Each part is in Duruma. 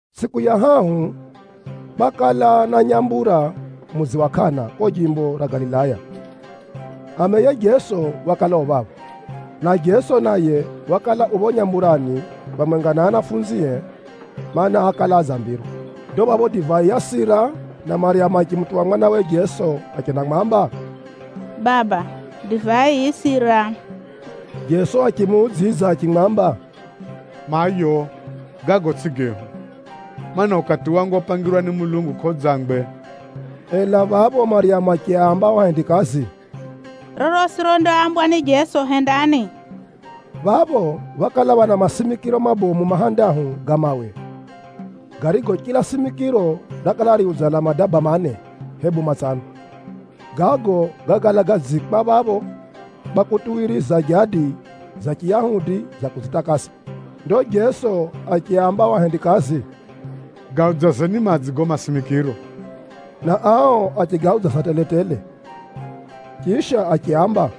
Tsʼiku ya hahu, kwakala na nyambura mudzi wa Kana kuko jimbo ra Galilaya. Ameye Jeso wakala u phapho, na Jeso naye wakala u phapho nyamburani phamwenga na anafunzie, mana, ákala adzambirwa. Ndo phapho divai yasira, na Maryamu achimutuwa mwanawe Jeso achendamwamba, “Baba, divai yisira!” Jeso achimuudzidza achimwamba, “Mayo, gago tsʼigo gehu, mana, ukati wangu opangirwa ni Mulungu kʼaudzangwe.” Ela phapho Maryamu achiaamba ao ahendikazi, “Rorosi rondaambwa ni Jeso, hendani.” Phapho phákala phana masimikiro mabomu mahandahu ga mawe, garigo chila simikiro rakala riudzala madaba mane, hebu matsano. Gago gákala gadziikwa phapho kwa kutuwiriza jadi za Chiyahudi za kudzitakasa. Ndo Jeso achiaamba ao ahendikazi, “Gaudzazeni madzi gago masimikiro,” na ao achigaudzaza tele-tele. Chisha achiaamba,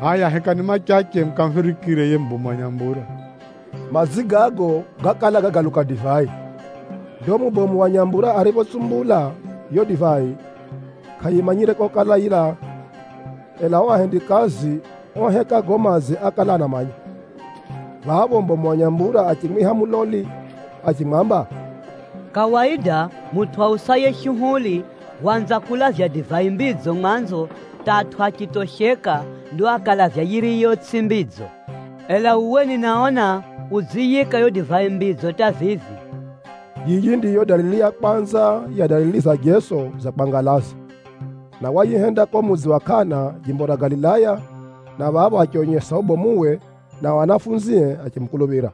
“Hʼaya hekani machache mukamuphirikire yiye mubomu wa nyambura.” Madzi gago gákala gagaluka divai. Ndo mubomu wa nyambura ariphotsumbula yiyo divai, kʼayimanyire kokala yilaa. Ela ao ahendikazi oheka gago madzi ákala anamanya. Phapho mubomu wa nyambura achimwiha muloli achimwamba, “Kawaida mutʼu ausaye shuhuli waanza kulavya divai mbidzo mwanzo hata atʼu achitosheka, ndo akalavya yiriyo tsʼiyo mbidzo. Ela uwe ninaona udziyiika yiyo divai mbidzo hata vivi!” Yiyi ndiyo dalili ya kwanza ya dalili za Jeso za kwangalaza, na wayihenda kuko mudzi wa Kana, jimbo ra Galilaya, na phapho achionyesa ubomuwe, nao anafunzie achimukuluphira.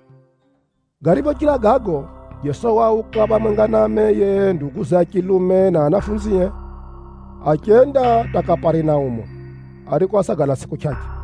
Gariphochira gago, Jeso wauka phamwenga na ameye, nduguze a chilume na anafunzie, achenda hata Kaparinaumu, ariko ásagala tsʼiku chʼachʼe.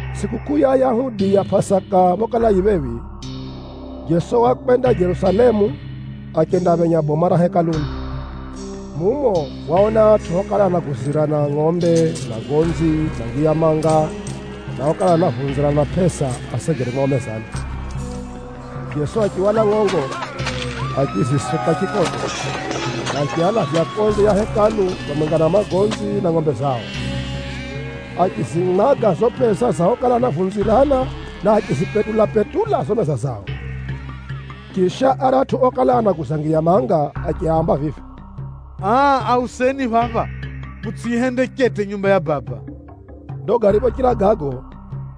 Tsʼikukʼuu ya Ayahudi ya Pʼasaka phokala yi phephi, Jeso wakwenda Jerusalemu, achendaphenya boma ra Hekaluni. Mumo, waona atʼu okala anaguzirana ngʼombe, magonzi na ngiya manga, na okala anavunzirana pʼesa asegere mwao mezani. Jeso achihwala ngʼongo, achizisuka chikoto, na achialavya konze ya Hekalu phamwenga na magonzi na ngʼombe zao. Achizimwaga zizo pʼesa za okala anavunzirana, na achizipetula-petula zizo meza zao. Chisha, aratʼu okala anaguza ngiya manga achiaamba vivi, “Aa auseni phapha. Mutsʼiyihende chete nyumba ya Baba!” Ndo gariphochira gago,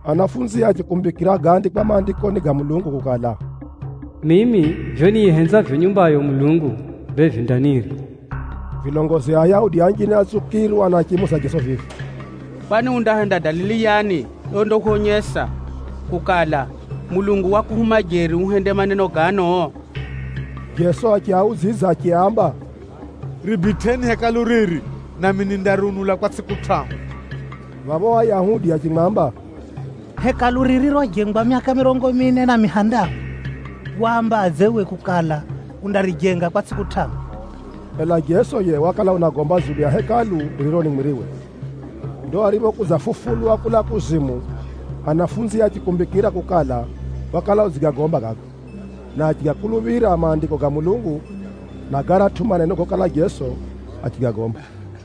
anafunzie achikumbikira gáandikwa Maandikoni ga Mulungu kukala, “Mimi vivyo niyihenzavyo nyumbayo Mulungu, bee vindanirya.” Vilongozi a Ayahudi anjine átsukirwa na achimuuza Jeso vivi, “Kwani undahenda dalili yani yondahwonyesa kukala, Mulungu wakuhuma jeri uhende maneno gano?” Jeso achiaudzidza achiaamba, “Ribitʼeni Hekalu riri, nami nindariunula kwa tsʼiku tʼahu.” Phapho ao Ayahudi achimwamba, “Hekalu riri rojengwa myaka mirongo mine na mihandahu, wambadze uwe kukala, undarijenga kwa tsʼiku tʼahu?” Ela Jeso yiye wakala unagomba dzulu ya Hekalu ririro ni mwiriwe. Ndo ariphokudzafufulwa kulaa kuzimu, ahumwae achikumbikira kukala, wakala udzigagomba gago, na achigakuluphira Maandiko ga Mulungu, na garatʼu maneno gokala Jeso achigagomba.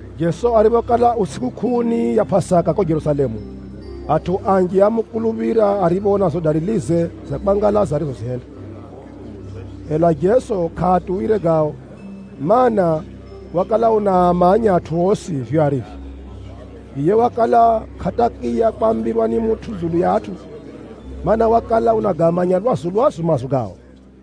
Jeso ariphokala u tsʼikukʼuuni ya Pʼasaka kuko Jerusalemu, atʼu anji ámukuluphira ariphoona zizo dalilize za kwangalaza arizozihenda. Ela Jeso kʼaatuwire gao, mana, wakala unaamanya atʼu osi vivyo arivyo. Yiye wakala kʼatakiya kwambirwa ni mutʼu dzulu ya atʼu, mana, wakala unagamanya lwazu-lwazu maazo gao.